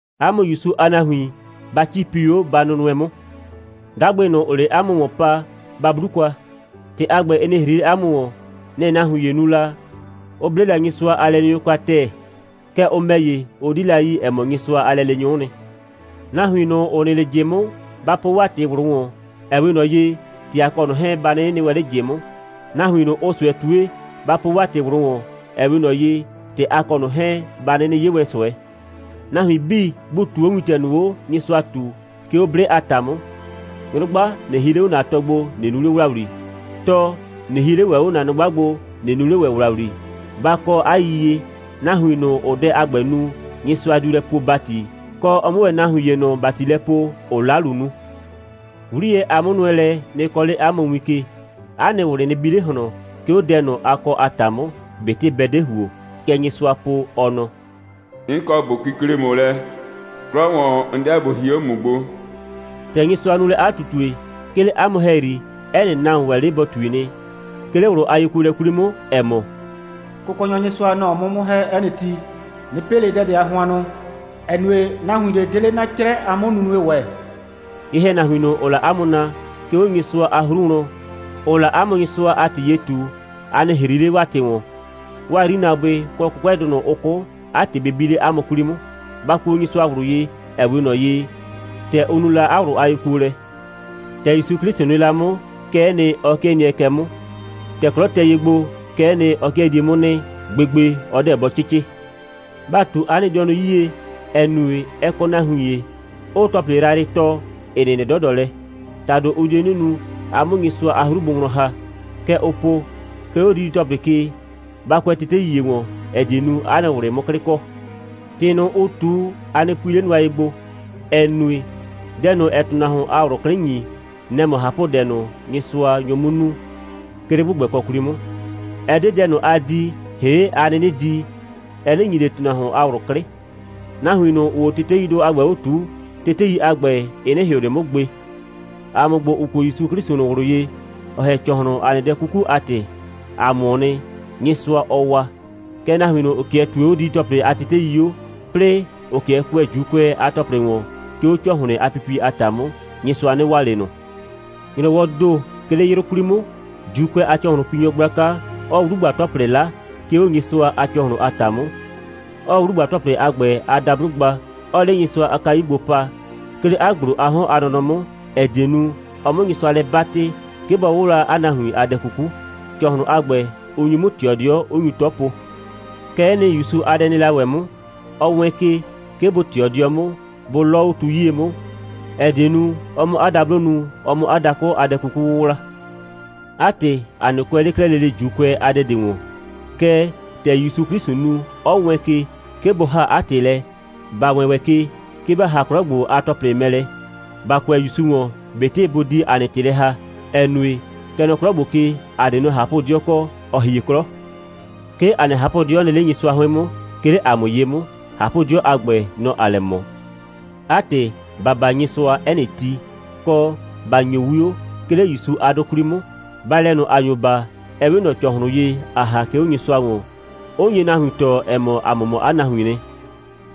'A mʋ ‑Yusu a nahuin, ba 'cipi 'o, ba nʋnʋɛ 'mʋ. 'Dagbɩ ꞊nʋ, ‑ʋʋ 'le 'a mʋ ‑wɔn pa, ba 'blu kwa. ‑Tɩ a ‑gbɛ, ɩ nɩ ‑hri 'le 'a mʋ ‑wɔn. Nɛ‑ nahuin ‑ye nu la, 'ʋ 'ble la Nyɩsʋa a lɛleenyʋ kwa ‑tɛɛ. Kɛɛ, ʋ ‑mɛ ‑ye, ʋ 'di la yi, ‑ɛ mɔ, Nyɩsʋa a lɛleenyʋ'ʋ nɩ. Nahuin ꞊nʋ, ‑ʋ nɩ 'le ꞊jɩ 'mʋ, ba po 'waa ‑tɩ ꞊wlʋ ‑wɔn, ‑ɛ 'we ꞊nɔ ye, ‑tɛ a kɔ ꞊nʋ 'hɛɛn, ba 'nɩnɩ nɩ wɛn 'le ꞊jɩ 'mʋ. Nahuin ꞊nʋ, ʋʋ ꞊sʋɛ ꞊tue, ba po ‑wɛ 'waa ‑tɩ ꞊wlʋ ‑wɔn, ‑ɛ 'we ꞊nɔ ye, ‑tɛ a kɔ ꞊nʋ 'hɛɛn, ba 'nɩnɩ 'ye wɛn ꞊sʋɛ. Nahuin 'bii, bʋ ꞊tuu 'o wintɛ ꞊nʋ 'o, Nyɩsʋa ꞊tu, 'ke 'o 'blɩ a ‑ta 'mʋ. Nyrʋgba, ꞊nɩ hie 'le 'o ‑na tɔ gbo, ꞊nɩ nu 'le ‑wlawli. Tɔ, ꞊nɩ hie 'le ‑wɛ 'o ‑na nyrʋgba gbo, ꞊nɩ nu 'le ‑wɛ ‑wlawli. Ba kɔ 'a yiyie, nahuin ꞊nʋ, ‑ʋʋ dɛ a ‑gbɛ nu, Nyɩsʋa diu lɛ poo ‑bati, kɔ, ɔ 'mʋ ‑wɛ nahuin ‑ye ꞊nʋ ‑bati lɛ poo, ‑ʋʋ 'lalu nu. 'Wliyɛ a 'mʋnʋɛlɛ nɩ kɔɔ 'le 'a mʋ win ke. 'A nɩ ꞊wlɩ nɩ bi 'le ꞊hlɔn, 'ke 'o dɛ ꞊nʋ, a kɔ a ‑ta 'mʋ, ꞊betɩ bɛ 'de ‑huo. Kɛ Nyɩsʋaa po, ɔ nɔ: «'N kɔ ꞊bo kikle ‑mʋ lɛ. 'Klɔ ‑wɔn, 'n 'deɛ ꞊bo hie 'o ‑mʋ gbo.» ‑Tɛ Nyɩsʋa nu lɛ 'a ꞊tutue, 'ke 'le 'a mʋ ‑hɛyri, 'ɛ nɩ nahuon ‑wɛ 'le bɔ ꞊tui nɩ, 'ke 'le ꞊wlʋ a yekuolɛ 'kwli 'mʋ, ‑ɛ mɔ: «Kʋkɔnyɔ Nyɩsʋa, nɔ‑ɔ 'mʋ 'mʋ ‑hɛ 'ɛ nɩ ti. 'Nɩ pɩ ꞊le dɛ ꞊de a hʋannʋ, ‑ɛ nue, nahuin ꞊de 'de 'le 'na 'crɛ a 'mʋnunue ‑wɛ.» Ye‑hɛnahuin ꞊nʋ, ‑ʋʋ la 'a mʋ naa, 'ke 'o Nyɩsʋa a 'hru wlɔn, ‑ʋʋ la 'a mʋ Nyɩsʋa a ‑tɩ ye ꞊tu, a nɩ ‑hri 'le 'waa ‑tɩ ‑wɔn. 'Waa 'yrinaabʋɩ, kɔ 'kʋkʋɛdʋ ꞊nʋ, ʋ 'kʋ, 'a ‑tɩ bɩ bi 'le 'a mʋ 'kwli 'mʋ. Ba kuo Nyɩsʋa ꞊wlʋ ye, ‑ɛ 'we ꞊nɔ ye, ‑tɛ ʋ nu la 'a ꞊wlʋ a yekuolɛ. ‑Tɛ ‑Yusu 'Klɩsʋ nɩ la 'mʋ, kɛ'ɛ nɩ, ɔ 'kɩɛ nɩɛ kɛ 'mʋ. ‑Tɛ 'klɔ tɛ ye gbo, kɛ'ɛ nɩ, ɔ 'kɩɛ die 'mʋ nɩ. Gbegbe, ɔ 'deɛ bɔ 'cɩcɩ. Ba ꞊tu 'a nɩ dɩɔnʋ 'yie, ‑ɛ nue, ɛ kɔ nahuin ‑ye, 'ʋʋ ‑tɔplɩ yrayrɩ tɔɔ, ‑ɩ nɩnɩ 'dɔdɔ lɛ. ‑Tado, ʋ die 'nɩ nu, a 'mʋ Nyɩsʋa a 'hru bʋ wlɔn ‑ha. Kɛ ʋʋ po: 'Ke 'o didi‑tɔplɩ ke, ba kʋɛ tetei ‑ye ‑wɔn, ‑ɛ die nu, 'a nɩ ꞊wlɩ 'mʋ 'klɩ kɔ. ‑Tɩ ꞊nʋ, ʋʋ ꞊tu, a nɩ pui 'le nʋa ye gbo, ‑ɛ nue, dɛ ꞊nʋ, ‑ɛɛ ‑tʋnahuon a ꞊wlʋ 'klɩ ‑nyi, nɛ‑ mɔ ꞊hapʋdɛ ꞊nʋ, Nyɩsʋa nyo 'mʋ nu, 'ke 'le ‑gbʋgbɛkɔ 'kwli 'mʋ. Ɛ 'de dɛ ꞊nʋ, ‑aa di, ‑hee' ‑a 'nɩnɩ di, ɛ 'nɩ ‑nyi ꞊le ‑tʋnahuon a ꞊wlʋ 'klɩ. Nahuin ꞊nʋ, ‑ʋʋ 'o teteidʋ a ‑gbɛ 'o ꞊tuu, tetei a ‑gbɛ, ɩ 'nɩ ‑hɩʋ ꞊le 'mʋ gbe. ‑A mʋ ‑gbo, ‑ʋ kuo ‑Yusu 'Klɩsʋ ꞊nʋ ꞊wlʋ ye, ‑ɔ ‑hɛ ‑cɔhlʋn, ‑a nɩ dɛ 'kuku a ‑tɩ, ‑a mʋʋ nɩ, Nyɩsʋa, ɔɔ waa. Kɛɛ, nahuin ꞊nʋ, ‑ʋ 'kɩɛ ꞊tue 'o didi‑tɔplɩ a tetei 'o, 'plɩɩ ‑ʋ 'kɩɛ kʋɛ ‑Juukʋɛ a ‑tɔplɩ ‑wɔn, 'ke 'o ‑cɔhlɩn a pipie a ‑ta 'mʋ, Nyɩsʋa 'nɩ waa ꞊le ꞊nʋ. ‑Nyrɔwɔɔ ‑do, 'ke 'le 'yrʋ 'kwli 'mʋ, ‑Juukʋɛ a ‑cɔhlʋnpinyɔ gblaka, 'ɔɔ 'wlugba‑tɔplɩ 'la, 'ke 'o Nyɩsʋa a ‑cɔhlʋn a ‑ta 'mʋ, 'ɔɔ 'wlugba‑tɔplɩ a ‑gbɛ a dablo gba, 'ɔɔ 'le Nyɩsʋa a kayu gbo pa, 'ke 'le 'a ‑gblo a 'hɔn a nɔnɔ 'mʋ, ‑ɛ die nu, ɔ 'mʋ Nyɩsʋa lɛ 'batɩ, 'ke bɔ 'wʋwla 'a nahuin a dɛ 'kuku. ‑Cɔhlʋn a ‑gbɛ, ʋ nyu 'mʋ ꞊tɩɔ 'dɩɔ, 'ʋ nyu 'tɔ po. Kɛ'ɛ nɩ, ‑Yusu a dɛ nɩ la ‑wɛ 'mʋ. Ɔ wɛɛn ke, 'ke bʋ ꞊tɩɔ 'dɩɔ 'mʋ, bʋ 'lɔɔ 'o tu 'yie 'mʋ, ‑ɛ die nu, ɔ 'mʋ 'a dablo nu, ɔ 'mʋ 'a dakʋ a dɛ 'kuku 'wʋwla. 'A ‑tɩ, ‑a 'nɩ kʋɛ 'le 'klɛɛ lele ‑Juukʋɛ a dɛ ‑wɔn. Kɛɛ, ‑tɛ ‑Yusu 'Klɩsʋ nu, 'ɔ wɛɛn ke, 'ke bʋ ‑haa 'a ‑tɩ lɛ, ‑ba wɛɛn ‑wɛ ke, 'ke ‑ba ‑ha 'klɔ ‑gbo a ‑tɔplɩ mɛ lɛ, ‑ba kʋɛ ‑Yusu ‑wɔn, ꞊betɩ bʋ di ‑a nɩ ‑tɩ lɛ ‑haa, ‑ɛ nue, kɛ nɔ 'klɔ ‑gbo ke, ‑a 'de nɔ ꞊hapʋ'dɩɔ kɔ, ‑ɔ hie 'klɔ. 'Ke ‑a nɩ ꞊hapʋ'dɩɔ nɩ 'le Nyɩsʋa 'hʋɩn 'mʋ, 'ke 'le ‑a mʋ ye 'mʋ. ꞊Hapʋ'dɩɔ a ‑gbɛ, nɔ‑ ‑aa lɛ ꞊mɔ. 'A ‑tɩ, ‑ba baa Nyɩsʋa, 'ɛ nɩ ti, kɔ, ‑ba ‑nyo 'wio, 'ke 'le ‑Yusu a 'dʋ 'kwli 'mʋ. Baalɛ ꞊nʋ, ‑a nyo baa, ɛ 'we ꞊nɔ ‑cɔhlʋn ye, ‑aa ‑ha, 'ke 'o Nyɩsʋa ‑wɔn, 'ʋ nye nahuin tɔɔ, ‑ɛ mɔ, ‑a mʋ mɔ 'a nahuiin nɩ.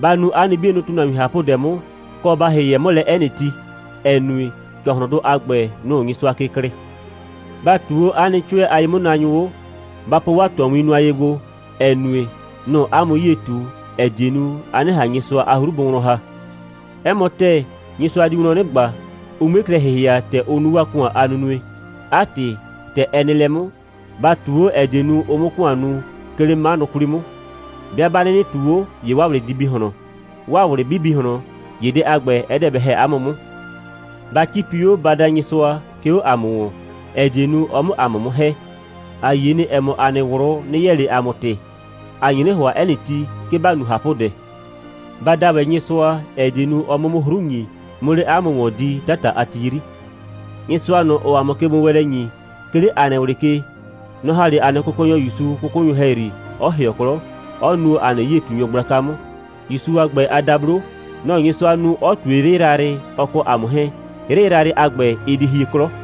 Ba nu 'a nɩ 'bienʋ ‑tʋnahuin ꞊hapʋdɛ 'mʋ, kɔ, ba ‑hɩhɛ 'mʋ lɛ 'ɛ nɩ ti, ‑ɛ nue, ‑cɔhlʋndʋ a ‑gbɛ, nʋ‑ʋ Nyɩsʋa ke klɩɩ. Ba ꞊tuu 'o 'a nɩ 'cʋɛ a ye'mʋnaanyʋ 'o. Ba po 'waa ꞊tɔwin nʋa ye gbo, ‑ɛ nue, nʋ‑ʋ 'a mʋ 'yie ꞊tu, ‑ɛ die nu, a 'nɩ ꞊han Nyɩsʋa a 'hru bʋ wlɔn ‑ha. 'Ɛ mɔ ‑tɛɛ, Nyɩsʋa diu wlɔn 'nɩ ꞊gba, ʋ 'mue klɛ ‑hɩhɩa, ‑tɛ ʋ nu 'waa ‑kʋan a nunue. 'A ‑tɩ, ‑tɛ ɛ nɩ lɛ 'mʋ, ba ꞊tuu 'o, ‑ɛ die nu, ʋ 'mʋ ‑kʋan nu, 'ke 'le 'manʋ 'kwli 'mʋ. 'Bɩa 'ba 'nɩnɩ ꞊tuu 'o, ‑ye 'waa ꞊wlɩ di bi ꞊hlɔn. 'Waa ꞊wlɩ 'bɩ bi ꞊hlɔn, ‑ye dɛ a ‑gbɛ, ɛ 'deɛ bɛ ‑hɛ 'a mʋ 'mʋ. Ba 'cipi 'o, ba da Nyɩsʋa, 'ke 'o ‑a mʋ ‑wɔn, ‑ɛ die nu, ɔ 'mʋ ‑a mʋ 'mʋ ‑hɛ. ‑A yie nɩ, ‑ɛ mɔ, ‑a nɩ ꞊wlʋ 'nɩ yɛɛ ꞊le ‑a mʋ ‑tɩ. ‑A nye 'nɩ ‑hʋa 'ɛ nɩ ti, 'ke ‑ba nu ꞊hapʋdɛ. Ba da ‑wɛ Nyɩsʋa, ‑ɛ die nu, ɔ 'mʋ 'mʋ 'hru ‑nyi, 'mʋ 'le 'a mʋ ‑wɔn di 'tata a ti 'yri. Nyɩsʋa ꞊nʋ, ‑ɔɔ ‑a mʋ kegbowɛɛnlɛ ‑nyi, 'ke 'le ‑a nɩ ꞊wlɩ ke, nɔ‑ ‑ha 'le ‑a nɩ Kʋkɔnyɔ ‑Yusu 'kʋkʋnyʋ ‑hɛyri, 'ɔ ‑hɩɔ 'klɔ, 'ɔ nuo ‑a nɩ 'yie꞊tunyɔ gblaka 'mʋ. ‑Yusu a ‑gbɛ a dablo, nɔ‑ Nyɩsʋa nu, 'ɔ ꞊tue 'yrɩ yrayrɩ, ɔ kɔ ‑a mʋ 'hɛɛn. 'Yrɩ yrayrɩ a ‑gbɛ, ɩ di hie 'klɔ.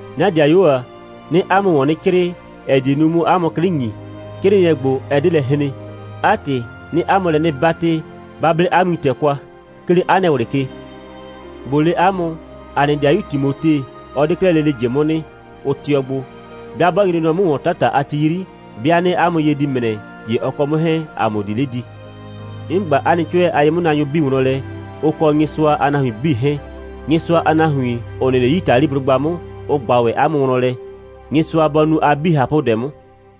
'Na 'dɩayuo ‑a, 'nɩɩ 'a mʋ ‑wɔn 'nɩ 'crɩɩ, ‑ɛ die nu, 'mʋ 'a mʋ 'klɩ ‑nyi. 'Crɩɩnɩɛ ‑gbo, ɛ 'de lɛ hren. 'A ‑tɩ, 'nɩɩ 'a mʋ lɛ 'nɩ 'batɩ, ba 'ble 'a wintɛ kwa, 'ke 'le 'a nɩ ꞊wlɩ ke. ꞊Bo le 'a mʋ: ‑A nɩ 'dɩayu Timote, ɔ 'de 'klɛɛ lele ꞊jɩ 'mʋ nɩ. Ʋ tɩɔ gbo. 'Bɩa 'bɔ nyre nɔ 'mʋ ‑wɔn 'tata a ti 'yri, 'bɩa 'nɩɩ 'a mʋ ye di ‑mrɛ, ‑ye ɔ kɔ 'mʋ 'hɛɛn, ‑a mʋ di 'le di. 'N ꞊gba 'a nɩ 'cʋɛ a ye'mʋnaanyʋ 'bii wlɔn lɛ, ʋ kɔ Nyɩsʋa a nahuin 'bii 'hɛɛn. Nyɩsʋa a nahuin, ‑ʋ nɩ 'le Yitaliblʋgba 'mʋ, ʋ ꞊gba ‑wɛ 'a mʋ wlɔn lɛ. Nyɩsʋa bɔ nu a 'bii ꞊hapʋdɛ 'mʋ.